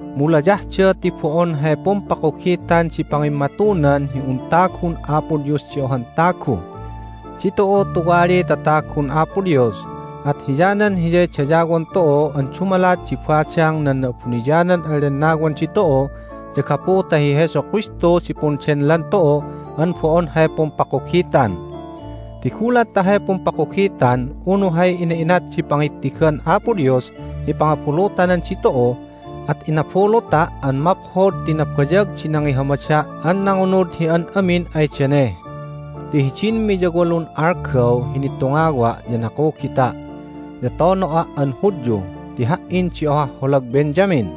Mu layahda ti bo'on hay pumpakugitan di pangimmatunan hi un tagun Apo Dios di ohan tagu. Ditu'u tuwaliy tatagun Apo Dios, at hiyanan Hiyay dayawon tu'u an dumalat di badang nan Na'abuniyanan an Lennawan ditu'u ya gapu ta hi Jesu Kristu di pundenlan tu'u an bo'on hay pumpakugitan. Ti gulat ta hay pumpakugitan unu hay ina'inat di pangittigan Apo Dios hi pangabulutanan ditu'u at inabuluta' an maphod ti nabayag di nangihamada' an nangunud hi an amin ay dane. Ti hidin miyawalun algaw hi nitungawa' ya nakugita', ya tono'a' an Hudyu ti ha"in di ohah holag Benjamin.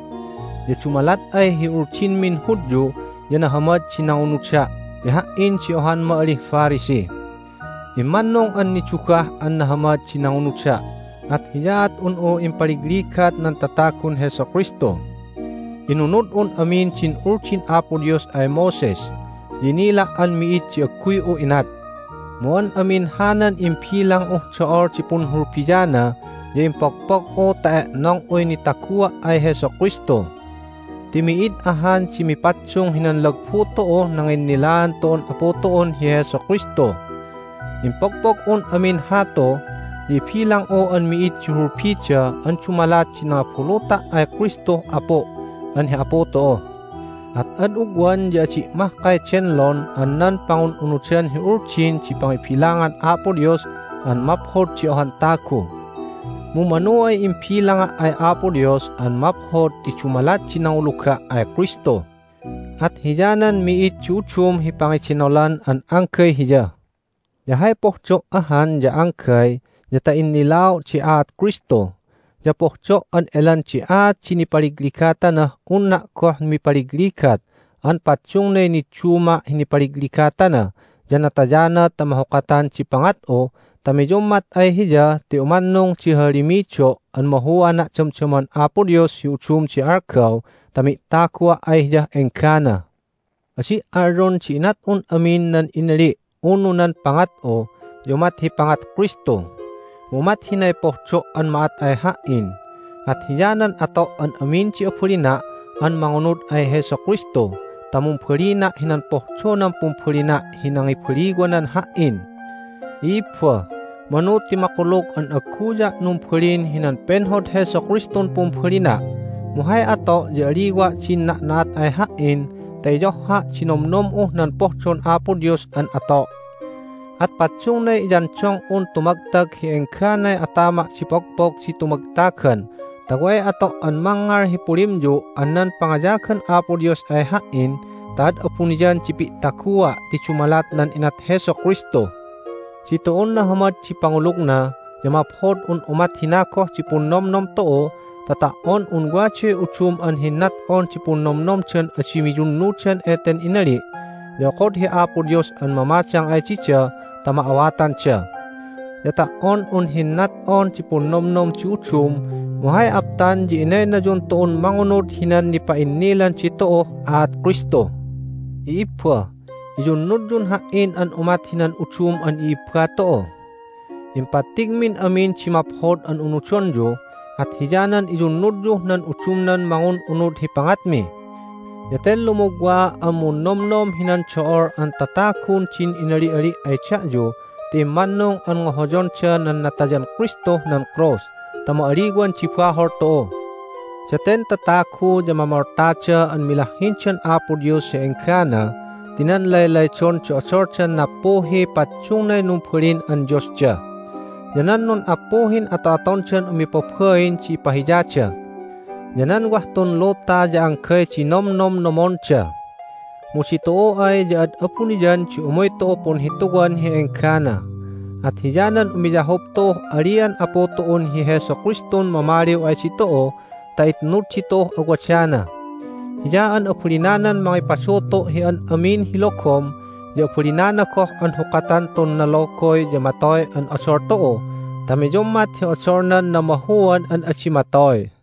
Ya dumalat ay hi Uldinmin Hudyu ya nahamad di nangunuda' ti ha"in di ohan ma'alih Pharisee. Immannung an nidugah an nahamad di nangunuda', at hiyaat un'u impaligligat nan tatagun Jesu Kristu. Inunud'un amin din Uldin Apo Dios ay Moses, ya inila' an mi'id di agguy'u inat. Mu an amin hanan imbilang'uh do'ol di punhulbiana ya impogpog'u ta e'nong'uy nitagua' ay Jesu Kristu. Ti mi'id ahan di mipaddung hinan lagbu tu'uh nanginnilaan tu'un Apu tu'un hi Jesu Kristu. Impogpog'un amin hatu, ya ibilang'u an mi'id di hulbida an dumalat di nangabuluta' ay Kristuh Apu' an hi Apu tu'u. At ad ugwan ya adi' mahkay denlon an nan pangun'unudan hi Uldin di pangibilangan Apo Dios an maphod di ohan tagu. Mu manu ay imbilanga' ay Apo Dios an maphod ti dumalat di nanguluga' ay Kristu. At hiyanan mi'id di udum hi pangidenolan an anggay Hiya. Ya hay pohdo' ahan ya anggay ya ta innilao' di aat Kristu, ya pohdo' an elan di aat di nipaligligatanah unna' goh mipaligligat an paddungnay nidduma' hi nipaligligatana ya natayana ta mahukatan di pangat'u ta miyummat ay Hiya ti umannung di hahalimido' an mahuana' damdaman Apo Dios hi udum di algaw ta mi'tagua' ay Hiyah enggana. Adi' alyon di inat'un amin nan inali' unu nan pangat'u ya umat hi pangat Kristu. Mu umat hinay pohdo' an ma'at ay ha"in, at hiyanan ato' an amin di abalina' an mangunud ay Jesu Kristu ta mumbalina' hinan pohdonan pumbalina' hi nangibaliwanan ha"in. I'ibba, manu ti makulug an agguya' numbalin hinan penhod Jesu Kristun pumbalina', mu hay ato' ya aliwa' din na'na'at ay ha"in ta iyohha' di nomnom'uh nan pohdon Apo Dios an ato'. At paddungnay iyandong'un tumagtag hi engganay atama' di pogpog di tumagtagan ta way ato' an mangngal hi pulimyu' an nan pangayagan Apo Dios ay ha"in ta ad abuniyan di pi'tagua' ti dumalat nan inat Jesu Kristu. Ditu'un nahamad di pangulugna ya maphod un umat hina goh di punnomnom tu'u ta ta"on un waday udum an hinnat'on di punnomnomdan adi miyunnudan eten inali' ya okod hi Apo Dios an mamadang ay dida ta ma'awatanda. Ya ta"on un hinnat'on di punnomnom di udum mu hay aptan ya inaynayun tu'un mangunud hinan nipa'innilan ditu'uh aat Kristu. I'ibba, iyunnudyun ha"in an umat hinan udum an i'ibba tu'u. Impattigmin amin di maphod an unudonyu, at hiyanan iyunnudyuh nan udumnan mangun'unud hi pangatmi. Ya ten lumugwaa' an munnomnom hinan do'ol an tatagun din inali'ali' ay da'yu ti immannung an ngohoyonda nan natayan Kristuh nan krus ta ma'aliwan di bahol tu'u. Daten tatagu ya mamoltada an milahhindan Apo Dios hi enggana ti nan laylaydon di odoldan nappuhiy paddungnay numbalin an diosda, ya nan nun'appuhin ato'atondan umipabain di ipahiyada. Ya nan wah tun luta ya anggay di nomnomnomonda. Mu ditu'u ay ya ad abuniyan di umuy tu'u punhituwan hi enggana, at hiyanan umiyahup tu'uh alian Apu tu'un hi Jesu Kristun mamaliw ay ditu'u ta itnud ditu'uh awadana. Hiya an abalinanan mangipadutu' hi an amin hi logom ya abalinana goh an hukatan tun nalogoy ya matoy an odol tu'u ta miyummat hi odolnan namahuan an adi matoy.